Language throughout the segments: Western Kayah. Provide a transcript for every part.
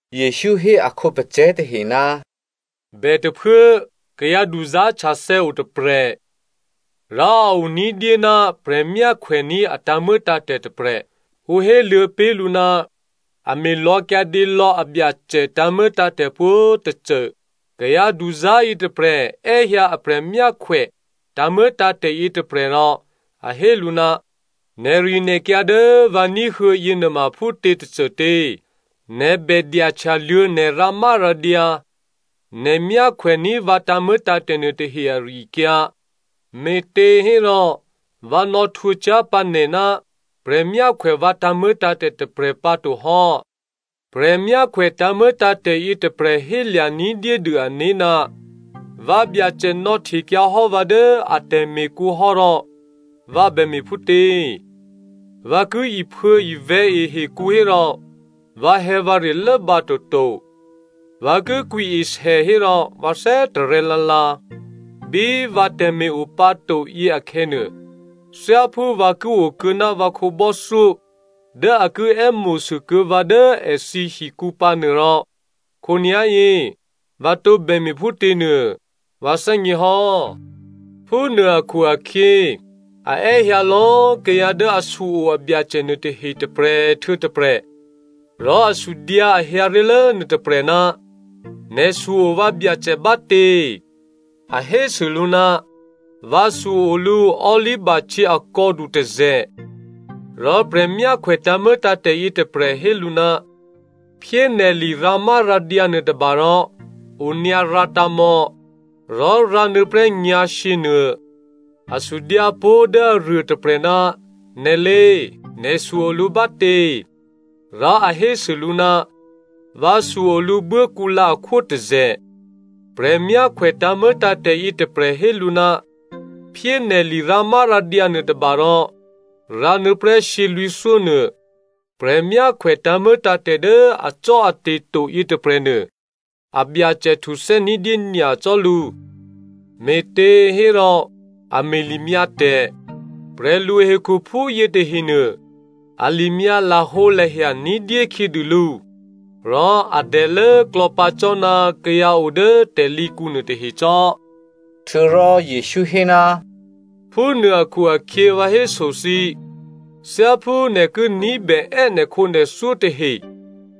Jesǔ hé a khǒpacè̤̌ tahe, “Bètôphuố kayǎ duzá̤htyathè̌ o tôprè̤. Rò a o ní̤dyé ná prè̤myákhwèní̤ a tǎ̤muô̌tǎ̤tè̤ tôprè̤. Ǔ héluô̌ pé̤ lǔ ná a me̤lò̌ kyǎdě lò̌ abyacè tǎ̤muô̌tǎ̤tè̤ pwǒ̤꤮ tôcô. Kayǎ duzá̤ yětôprè̤ è́hyǎ aprè̤ myákhwè tǎ̤muô̌tǎ̤tè̤ yětôprè̤ rò a hé lǔ, ‘Nè̤rinè̤kyǎ dố vǎ ní̤huô̌ yěnuôma phútě tôcôtě? Nè̤ bè dyahtyaluô̌ nè̤ rǎmárǎdyǎ, nè̤ myákhwèní̤ vǎ tǎ̤muô̌tǎ̤tè̤ nuôtahe ari-akyǎ, me̤těhérò vǎ nò̌ htwǒ cyá̤ pǎ nè̤ ná prè̤myákhwè vǎ tǎ̤muô̌tǎ̤tè̤ tôprè̤ pǎto hò́.’ “Prè̤myákhwè tǎ̤muô̌tǎ̤tè̤ yětôprè̤ hélya̤ ní̤dyédû ané̤, ‘Vǎbyacè nò̌htekyǎhò́ vǎ dố a tè̤me̤kǔ hò́ rò vǎ bème̤ phútě? Vǎ ki iphuô̌ivè̤̌ e hekǔ hérò, vǎhè̌vǎre lốbǎ toto, vǎ ki kwǐesè hérò, vǎ thè́tarè̤̌ lǎlǎ. Bí vǎ tè̤me̤ o pǎ to yěakhè̌nuô, thyáphú vǎ ki o kuô̌ná vǎ khǒbò́thyó dố a ki è́mo̤sû kuô̌ vǎ dố èthǐ hikǔ pǎnuô rò, khǒnyá̤yě vǎ tǒbè me̤phútě nuô, vǎ thè́gně hò́.’ “Phúnuô akhu-akhyě, a è́hyǎ lò̌꤮ kayǎ dố a su-o abyacè nuôtahe tôprè̤ htuô̌ tôprè̤. Rò a sudyǎ a hyǎ ré̤lố nuôtôprè̤, ‘Nè̤ su-o vǎbyacè bátě?’ “A hésû lǔ, ‘Vǎ su-o lǔ olivahtyě akò̌du tôzè̤.’ “Rò prè̤myákhwè tǎ̤muô̌tǎ̤tè̤ yětôprè̤ hé lǔ, ‘Phyé nè̤ lirǎmárǎdyǎ nuôtôba rò onyǎ rǎtǎ̤ mò̌, rò rǎnuô̌ prè́ nyǎ̤shyě nuô.’ “A sudyǎ pó̤ dố aruôtôprè̤, ‘Nè̤lé꤮ nè̤su o lǔ bátě?’ “Rò a hésû lǔ, ‘Vǎsu o lǔ buốkǔlǎ akhwótôzè̤.’ Prè̤myákhwè tǎ̤muô̌tǎ̤tè̤ yětôprè̤ hé lǔ, ‘Phyé nè̤ lirǎmárǎdyǎ nuôtôba rò rǎnuô̌ prè́ shyělwǐ̤thyó nuô.’ “Prè̤myákhwè tǎ̤muô̌tǎ̤tè̤ dố acò́ate̤ to yětôprè̤nuô, abyacè htuthè́ ní̤dyé nyacò́ lǔ, me̤těhérò a me̤limyǎ tè̤. Prè̤luhekhuphú yětahenuô a limyǎ lahǒlahya ní̤dyé khyědû lǔ, rò a dèlốklò̌ pǎ cò́ ná kayǎ o dố tè̤lǐkǔ nuôtahe cò́.” Htuô̌rò Jesǔ hé, “Phúnuô akhu-akhyě vǎ héso thǐ, thyáphú nè̤ ki ní̤bè è́ nè̤khǒnè̤thyó tahe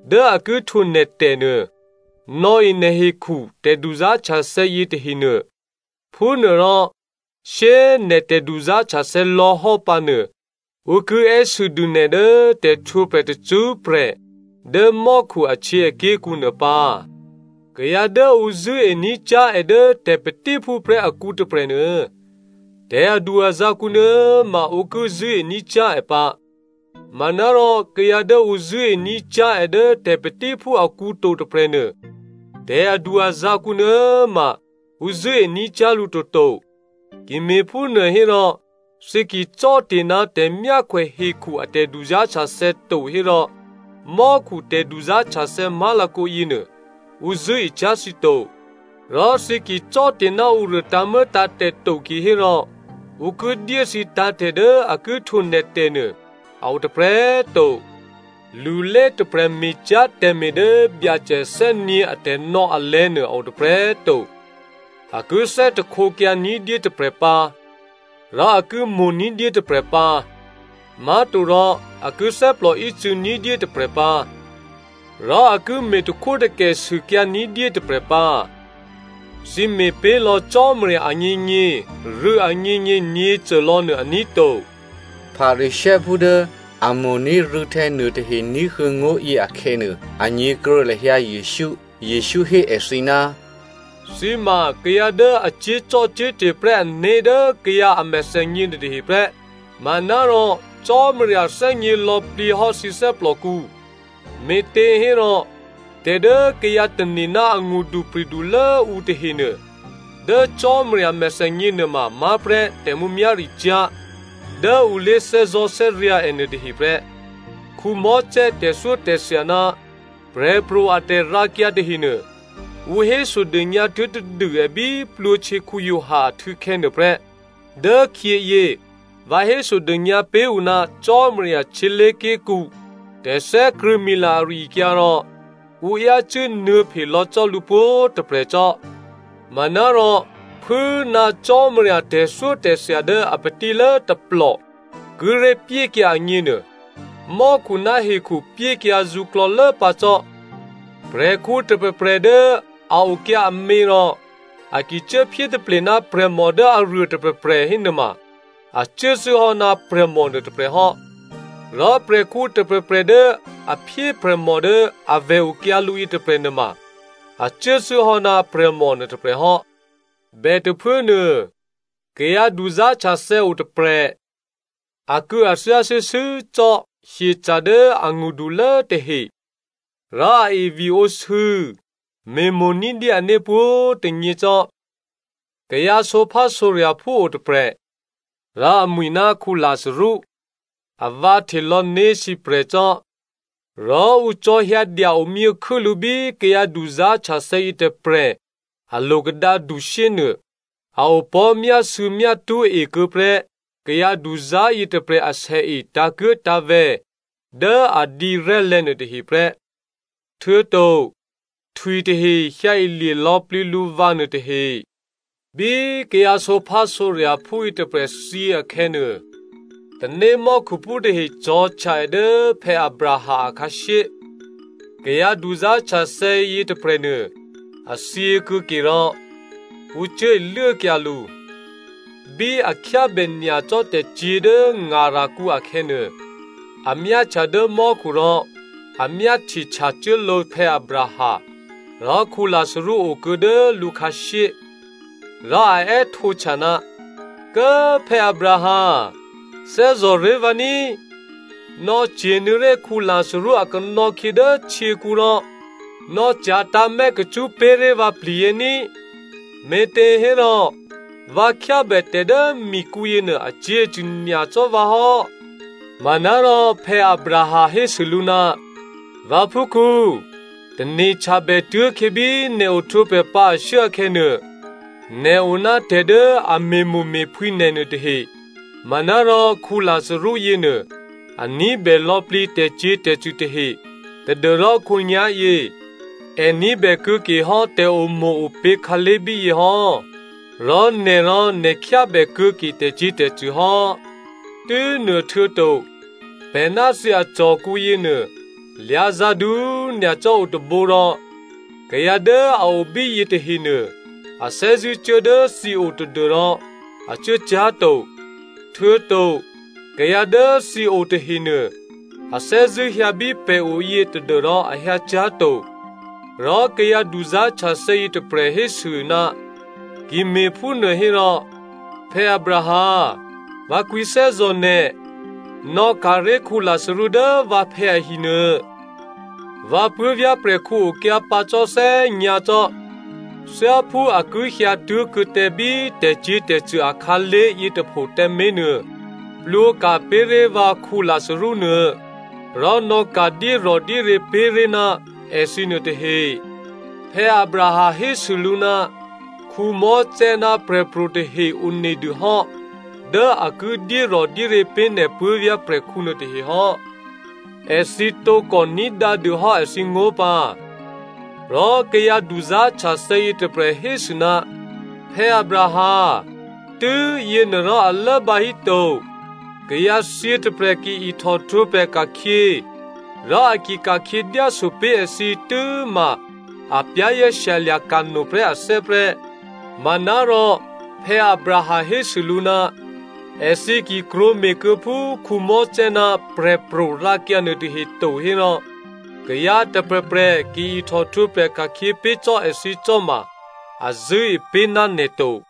dố a ki htwǒ nè̤tè̤ nuô, nò̌e nè̤hekhu tè̤duzá̤htyathè̌ yětahenuô. Phúnuôrò shyé꤮ nè̤ tè̤duzá̤htyathè̌ lò̌hò́ pǎnuô, ǔ ki è́sû dû nè̤ dố tè̤htwǒprè̤ tacṳ́prè̤ dố mò́khu ahtyěaké̤kǔ nuô pǎ. “Kayǎ dố ǔ zṳ̂́ení̤ cyá̤ è dố tè̤patíphú prè́ akǔ tôprè̤nuô, tè̤adu-azǎ̤ kǔnuô̌꤮ ma ǔ ki zṳ̂́ení̤ cyá̤ è pǎ. Manárò kayǎ dố ǔ zṳ̂́ení̤ cyá̤ è dố tè̤patíphú akǔ to tôprè̤nuô, tè̤adu-azǎ̤ kǔnuô̌꤮ ma ǔ zṳ̂́ení̤ cyá̤ lǔ toto. Ki me̤phúnuô hérò, thǐ ki cò́te̤ ná tè̤myákhwè hekhu a tè̤duzá̤htyathè̌ to hérò, mò́khu tè̤duzá̤htyathè̌ má̤lakǒ yěnuô, ǔ zṳ̂́e cyá̤ thǐ to. Rò thǐ ki cò́te̤ ná ǔruô tǎ̤muô̌tǎ̤tè̤ to kihérò ǔ ki dyé thǐ tǎ̤tè̤ dố a ki htwǒ nè̤ tè̤nuô a o tôprè̤꤮ to. “Lulé tôprè̤ me̤cyá̤ tè̤me̤ dố Byacè thè́nyě̤ atè̤nò̌ alè̤̌nuô a o tôprè̤꤮ to. A ki thè́htekyǎ ní̤dyé tôprè̤ pǎ, rò a ki mo̤ ní̤dyé tôprè̤ pǎ. Má̤torò a ki thè́plòícû̌ ní̤dyé tôprè̤ pǎ, rò a ki me̤takhwótakè sûkyǎ ní̤dyé tôprè̤ pǎ. Thǐ me̤pé̤lò̌ Cò́marya agněgně, rû̌ agněgně nyě̤côlò̌ nuô, aní̤ to.” Pharisěophú dố a mo̤ní̤ rû̌htè̌ nuôtahe ní̤huô̌ ngó̤yě akhè̌nuô, a nyě̤kruô̌ lahyǎ Jesǔ. Jesǔ hé èthǐ, “Thǐ ma kayǎ dố a cyé̤zò́cò́te̤ prè́ ané̤ dố kayǎ a mèthènyě nuôtahe prè́, manárò Cò́marya thè́gně lò̌plǐ hò́ thǐ thè́plòkǔ. Me̤těhérò, tè̤ dố kayǎ tane̤ ná angṳdupri̤dulố ǔ tahenuô, dố Cò́marya mèthènyě nuôma má̤ prè́ tè̤mǔmyá̤ricyá̤ dố ǔ lé̤thè́zò̤́thè́ryǎ̤ è nuôtahe prè́. “Mosè tè̤thyótè̤thya ná prè̤pro̤ a tè̤rǎkyǎ tahenuô, ǔ hésodônyǎ tuố̤ tadû è bí Giovanni Baptista a htû̌khè̌ nuôprè́. Dốkhyěyě vǎ hésodônyǎ pé̤ ǔ ná Cò́marya htyělé̤ké̤kǔ tè̤thè́krṳ̂̌mila ari-akyǎ rò ǔ yácû́ nuô̌phe lò̌ cò́ lǔ pwǒ̤꤮ tôprè̤ cò́. Manárò phû꤮ ná Cò́marya a tè̤thyótè̤thya dố a patílố tôplò kíré̤ pyékyǎ agněnuô, mò́khu ná hekhu pyékyǎ zǔklò̌lố pǎ cò́. “Prè̤khǔ tôprè̤prè̤ dố a okyǎ amě rò a ki cuốphyé taple ná prè̤mò dố aruô tôprè̤prè̤ hénuôma a cuốthû́hò́ ná prè̤mò nuôtôprè̤ hò́. Rò prè̤khǔ tôprè̤prè̤ dố a phyé prè̤mò dố a vè̤ okyǎ lǔ yětôprè̤ nuôma a cuốthû́hò́ ná prè̤mò nuôtôprè̤ hò́. “Bètôphuốnuô, kayǎ duzá̤htyathè̌ otôprè̤. Akû̌athyá shuô̌shuô̌ cò́ hyeca̤ dố angṳdulố tahe, rò a eviǒsû̌, me̤mo̤ ní̤dyé ané̤ pwǒ̤꤮ tônyě cò́. Kayǎ sǒphásǒrya̤phú otôprè̤. Rò amwi̤ ná Lazarú. Avǎ htelò̌ né̤sǐprè̤ cò́, rò ǔ cò̤̌hyǎ dya omyěkhû́ lǔ bí kayǎ duzá̤htyathè̌ yětôprè̤ a lo̤kadǎdu shyé nuô. A opò̤́ myásû̌myátṳ́ e kuô̌ prè́ kayǎduzá̤ yětôprè̤ asèe tǎ̤kuố̤tǎ̤vè̤̌ dố a dǐrè̤́lè̤̌ nuôtahe prè́. Htuô̌to htwitahe hyǎilye lò̌plǐ lǔvǎ nuôtahe. “Bí kayǎ sǒphásǒrya̤phú yětôprè̤ thyě akhè̌nuô, tanémò́khuphú tahe cò̤̌htya è dố Abraham akhǎshyé. Kayǎ duzá̤htyathè̌ yětôprè̤nuô, a thyěkuô̌ke rò ǔ cuố iluốkyǎ lǔ. Bí a khyábè nyacò́ tè̤cyě̤ dố ngarakǔ akhè̌nuô, a myáhtya dố mò́khu rò a myáhtye htyacuốlǒ Abraham, rò Lazarú okuô̌ dố lǔ khǎshyé. Rò a è́htǒhtya, ‘Kố꤮ Abraham꤮! Thè́zò̤ré̤ vǎ ní꤮, nò̌cye̤nuô̌ré̤ Lazarú a kanò̌khyě dố htyěkǔ rò nò̌cya̤tǎ̤mè̌ kacṳ́ pé̤ré̤ vǎ pli̤yě ní꤮, me̤těhérò vǎ khyábè tè̤ dố mikǔ yěnuô acyě̤acṳ̂ nyacò́ vǎ hò́.’ “Manárò Abraham hésû lǔ, ‘Vǎphúkhǔ꤮ tane̤htyabè tuố̤khyě bí nè̤ ohtwǒprè̤ pǎ ashuốkhè̌nuô, nè̤ o ná tè̤ dố a me̤mo̤me̤phwǐ nè̤ nuôtahe, manárò Lazarú yěnuô, a ní̤bè lò̌plǐ tè̤cyě̤tè̤cṳ̂ tahe, tadû́rò khǒnyá̤yě, è ní̤bè kuô̌ke hò́ tè̤omo̤-opě̤ khǎlé̤ bíyě hò́, rò nè̤ rò nè̤ khyábè kuô̌ke tè̤cyě̤tè̤cṳ̂ hò́. Tû́nuôhtuô̌to, pè̤ ná thǐ acò̤kǔ yěnuô, lyǎ̤zǎ̤du꤮ nyacò́ o tôbǒ rò kayǎ dố a o bíyě tahenuô, a thè́zṳ̂́ cuố dố thǐ o tadû́rò a cuố cyá̤ to, htuô̌to kayǎ dố thǐ o tahenuô, a thè́zṳ̂́ hyǎ bí pè̤ o yě tadû́rò a hyǎ cyá̤ to.’ “Rò kayǎ duzá̤htyathè̌ yětôprè̤ hésû, ‘Ki me̤phúnuô hérò, Abraham꤮, vǎ kwǐthè́zò̤ nè̤, nò̌ka̤ré̤ Lazarú dố vǎphè̌ ahi nuô. Vǎ puố̤vyá̤ prè̤khǔ okyǎ pǎ cò́ thè́nyǎ̤ cò́. Thyáphú a ki hyǎtuố̤kuô̌ tǎ bí tè̤cyě̤tè̤cṳ̂ akhǎlé̤ yětôpho tǎmé̤ nuô, plwǒka̤ pé̤ré̤ vǎ Lazarú nuô, rò nò̌ka̤ dyérò̤dyéryě̤ pé̤ré̤ ná èthǐ nuôtahe.’ “Abraham hésû lǔ, ‘Mosè ná prè̤pro̤ tahe one dû hò́ dố a ki dyérò̤dyéryě̤ pé̤ nè̤ puố̤vyá̤ prè̤khǔ nuôtahe hò́. Èthǐ tǒkò ní̤dǎ dûhò́ èthǐngó̤ pǎ.’ “Rò kayǎ duzá̤htyathè̌ yětôprè̤ hésû, ‘Abraham꤮ tû́yěnuô rò a lốbǎ híto. Kayǎthyě tôprè̤ ki ihtòhtwǒprè̤ ka̤khyě, rò a ki ka̤khyě dyáso pé̤ èthǐ tû́ma a za̤ ní̤ no prè́ ané̤ prè́.’ “Manárò Abraham hésû lǔ, ‘Èthǐ ki krwǒme̤ kuô̌ phú Mosè ná prè̤pro̤ rǎkyǎ nuôtahe to hérò, kayǎ tôprè̤prè̤ ki ihtòhtwǒprè̤ ka̤khyě pé̤ cò́ èthǐ cò́ ma, a zṳ̂́e pé̤ ná nè̤ to.’”